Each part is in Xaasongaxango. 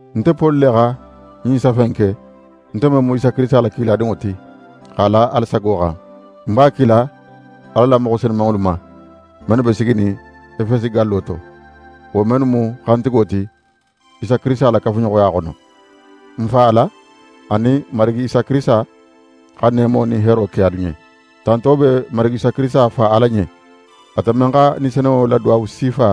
Nte Poli le xa ɲin safe in ke, nte men mu Isa Kirisita la kiladinŋo ti, x'a la Ala sago xan. Ń b'a kila Ala la moxo senunŋolu ma, mennu be siginin Efesi gallo to, wo mennu mu xantigo ti Isa Kirisita la kafuɲoxoya xono. N Fa Ala anin Marigi Isa Kirisita xa neemo nin heero ke alu ɲen. Tanto be n Marigi Isa Kirisita Fa Ala ɲen, ate men xa Ni Senunŋo la duwawu sifa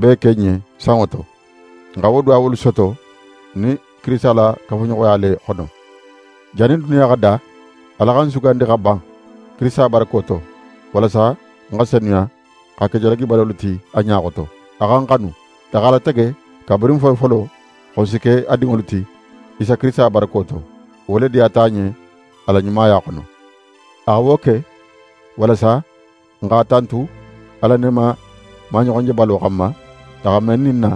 bee ke n ɲen sanŋo to. N xa wo duwawolu soto n nin Kirisita la kafuɲoxoya le xono. Jannin duniya xa da, Ala xa n sugandi xa ban, Kirisita barako to, walasa n xa senuya xa ke jalagibalolu ti a ɲa xoto. A xa n xanu, x'a latege kabirin folofolo, xo n si ke a dinŋolu ti, Isa Kirisita barako to. Wo le diyata a ɲen a la ɲumaya xono. A xa wo ke, walasa n x'a tantu a la neema maɲoxonjebalo xanma, a xa men ni n na,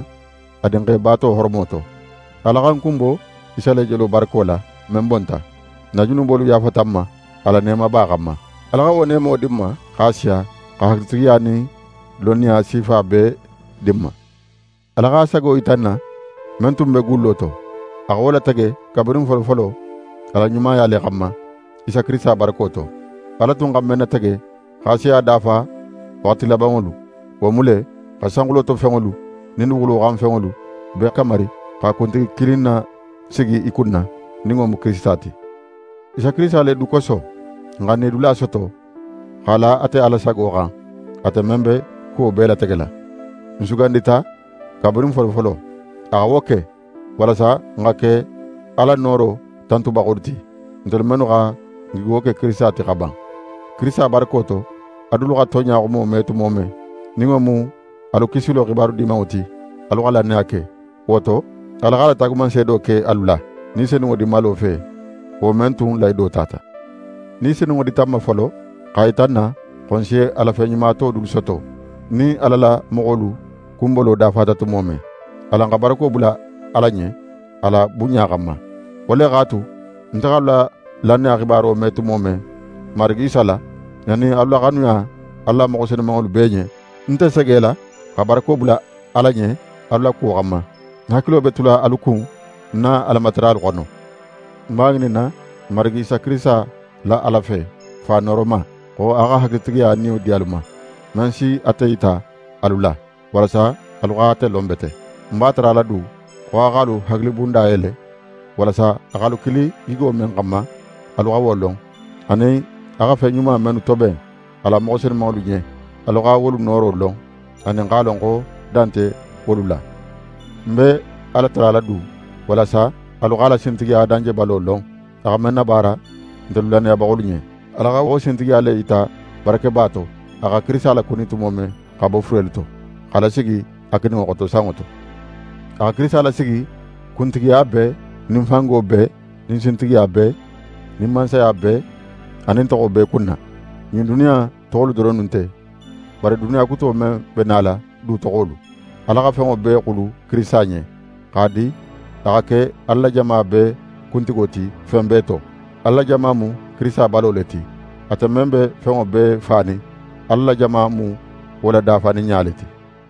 a Dinxe baato horomo to. Ala xa n kunbo Isa le jelo barako la, men bonta. N na junubolu yaafata n ma, a la neemaba xanma. Ala xa wo neemo di n ma, x'a siya, xa hakilitigiya nin lonniya sifa bee di n ma. Ala x'a sago yita n na, men tun be gullo to. A xa wo latege kabirin folofolo a la ɲumaya le xanma, Isa Kirisita barako to. Ala tun xa men natege x'a si a dafa waxati labanŋolu, wo mu le, xa sanxulo to fenŋolu nin duguxulo xan fenŋolu bee kamari xa kuntigi kilin nasigi i kunna, nin wo mu Kirisita ti. Isa Kirisita le du koso, n xa n nidula soto, x'a la ate Ala sago xan, ate men be kuwo bee lategela: N sugandita kabirin folofolo. A xa wo ke, walasa n xa ke Ala nooro tantubaxolu ti, ntelu mennu xa n gigo ke Kirisita ti xa ban. Kirisita barako to, alu dulu xa tonɲa xumo me tumo men, nin wo mu alu kisilo xibaru Dimanŋo ti, alu xa lannaya ke. Wo to, Ala x'a la taagumanseedo ke alu la, Ni Senunŋo dinmalo fe, wo men tun lahido tata. Ni Senunŋo dita n ma folo, x'a yita n na, xo n si a la fen ɲuma to dulu soto, nin Ala la moxolu kunbolo dafata tumo men. Alan xa barako bula Ala ɲen, a la bunɲa xanma. Wo le x'a tu, nte x'alu la lannaya xibaro me tumo men Marigi Isa la, anin alu la xanuya Ala la moxo senunŋolu bee ɲen, ń nte segela xa barako bula Ala ɲen alu la kuwo xanma. Ń hakilo be tula alu kun ń na Alamataralu xono. Ń b'a ŋininna n Marigi Isa Kirisita la Ala fe, Fa nooroma, xo a xa hakilitigiya Niyo di alu ma, men si ate yita alu la, walasa alu xa ate lon bete. Ń b'a tarala du, xo a x'alu hakilibunda yele, walasa a x'alu kili gigo men xanma, alu xa wo lon, anin a xa fen ɲuma mennu toben a la moxo senunŋolu ɲen, alu xa wolu nooro lon, anin x'a lon xo dan nte wolu la. Ń be Ala tarala du, walasa alu x'a la sintigiya danjebalo lon, a xa men nabaara ntelu lannayabaxolu ɲen. Ala xa wo sintigiya le yita barakeba to, a xa Kirisita lakuni tumo men xa bo furelu to, x'a lasigi a kininŋo xoto, sanŋo to. A xa Kirisita lasigi kuntigiya bee nin fango bee nin sintigiya bee nin mansaya bee anin toxo bee kunna. Ɲin duniya in toxolu doronnu nte; bari duniya kuto men be nala du toxolu. Ala xa fenŋo bee xulu Kirisita ɲen, x'a di a xa ke Ala la jama bee kuntigo ti fen bee to. Ala la jama mu Kirisita balo le ti. Ate men be fenŋo bee fanin, Ala la jama mu wo la dafaninɲa le ti.